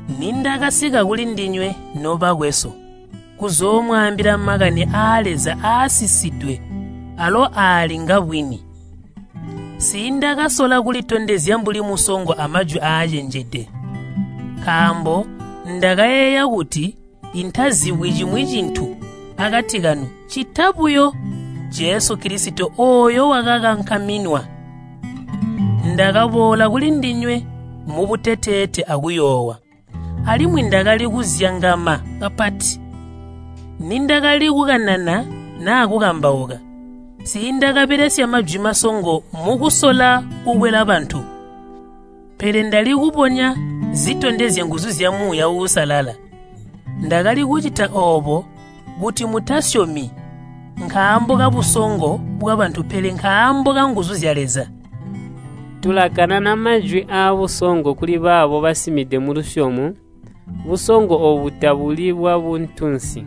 Nindakasika kulindinywe, nobakwesu, kuzoomwaambila makani aa Leza aasisidwe alo aali ngabwini, nsiindakasola kulitondezya mbuli musongo amajwi acenjede. Nkaambo ndakayeeya kuti intazibyi cimwi cintu akati kanu ccita buyo Jesu Kilisito ooyo wakakankaminwa. Ndakaboola kulindinywe mubuteteete akuyoowa. Alimwi ndakali kuzyangama kapati. Nindakali kukanana naa kukambauka, nsiindakabelesya majwi masongo mukusola kukwela bantu, pele ndali kubonya zitondezya nguzu zya Muuya Uusalala. Ndakali kucita oobo kuti mutasyomi nkaambo kabusongo bwabantu pele nkaambo kanguzu zya Leza. Tulakanana majwi aabusongo kulibaabo basimide mulusyomo. Busongo oobu tabuli bwabuntunsi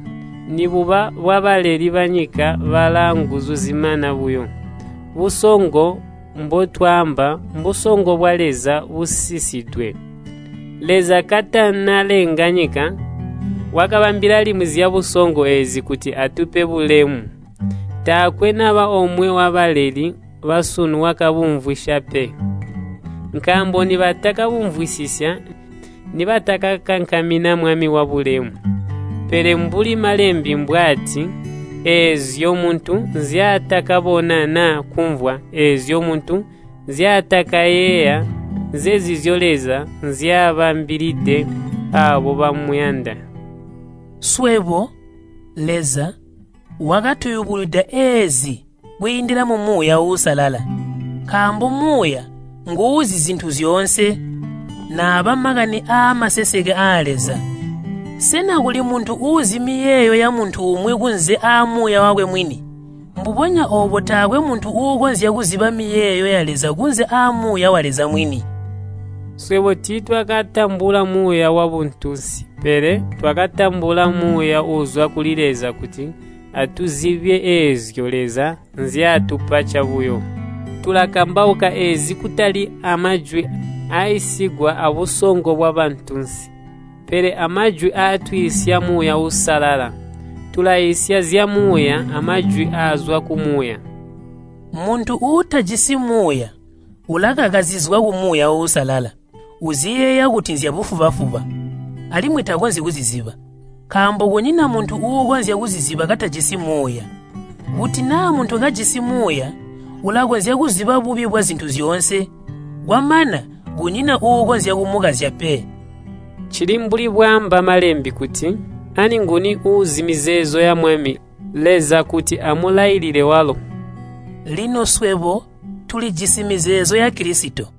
nibuba bwabaleli banyika balaanguzu zimana buyo. Busongo mbotwaamba, mbusongo bwa Leza busisidwe. Leza katanalenga nyika, wakabambila limwi zyabusongo eezi kuti atupe bulemu. Taakwe naba omwe wabaleli basunu wakabumvwisya pe, nkaambo nibakabumvwisisya nibatakakankamina Mwami wabulemu. Pele mbuli Malembe mbwaati, “Eezyo muntu nzyaatakabona naa kumvwa, eezyo muntu nzyaatakayeeya, nzenzizyo Leza nzyabambilide aabo bamuyanda.” Swebo, Leza, wakatuyubunwida eezi kwiindila mu Muuya Uusalala. Nkaambo Muuya nguuzi zintu zyoonse, naaba makani aamaseseke aa Leza. Sena kuli muntu uuzi miyeeyo yamuntu umwi kunze aamuuya wakwe mwini? Mbubonya oobo taakwe muntu uukonzya kuziba miyeeyo ya Leza kunze aa Muuya wa Leza mwini. Swebo tiitwakatambula muuya wabuntunsi, pele twakatambula Muuya uuzwa kuli Leza, kuti atuzibye eezyo Leza nzyatupa cabuyo. Tulakambauka eezi kutali amajwi aaiisigwa abusongo bwabantunsi, pele amajwi aatwiisya Muuya Uusalala. Tulaiisya zyamuuya amajwi aazwa ku Muuya. Muntu uutajisi Muuya ulakaka zizwa ku Muuya Uusalala. Uziyeeya kuti nzyabufuba-fuba, alimwi takonzyi kuziziba, nkaambo kunyina muntu uukonzya kuziziba katajisi Muuya. Kuti naa muntu kajisi Muuya ulakonzya kuziba bubi bwazintu zyoonse kwamana kunyina uukonzya kumukazya pe. Cili mbuli bwaamba Malembe kuti, “Ani nguni uuzi mizeezo ya Mwami Leza kuti amulailile walo?” Lino swebo tulijisi mizeezo ya Kilisito.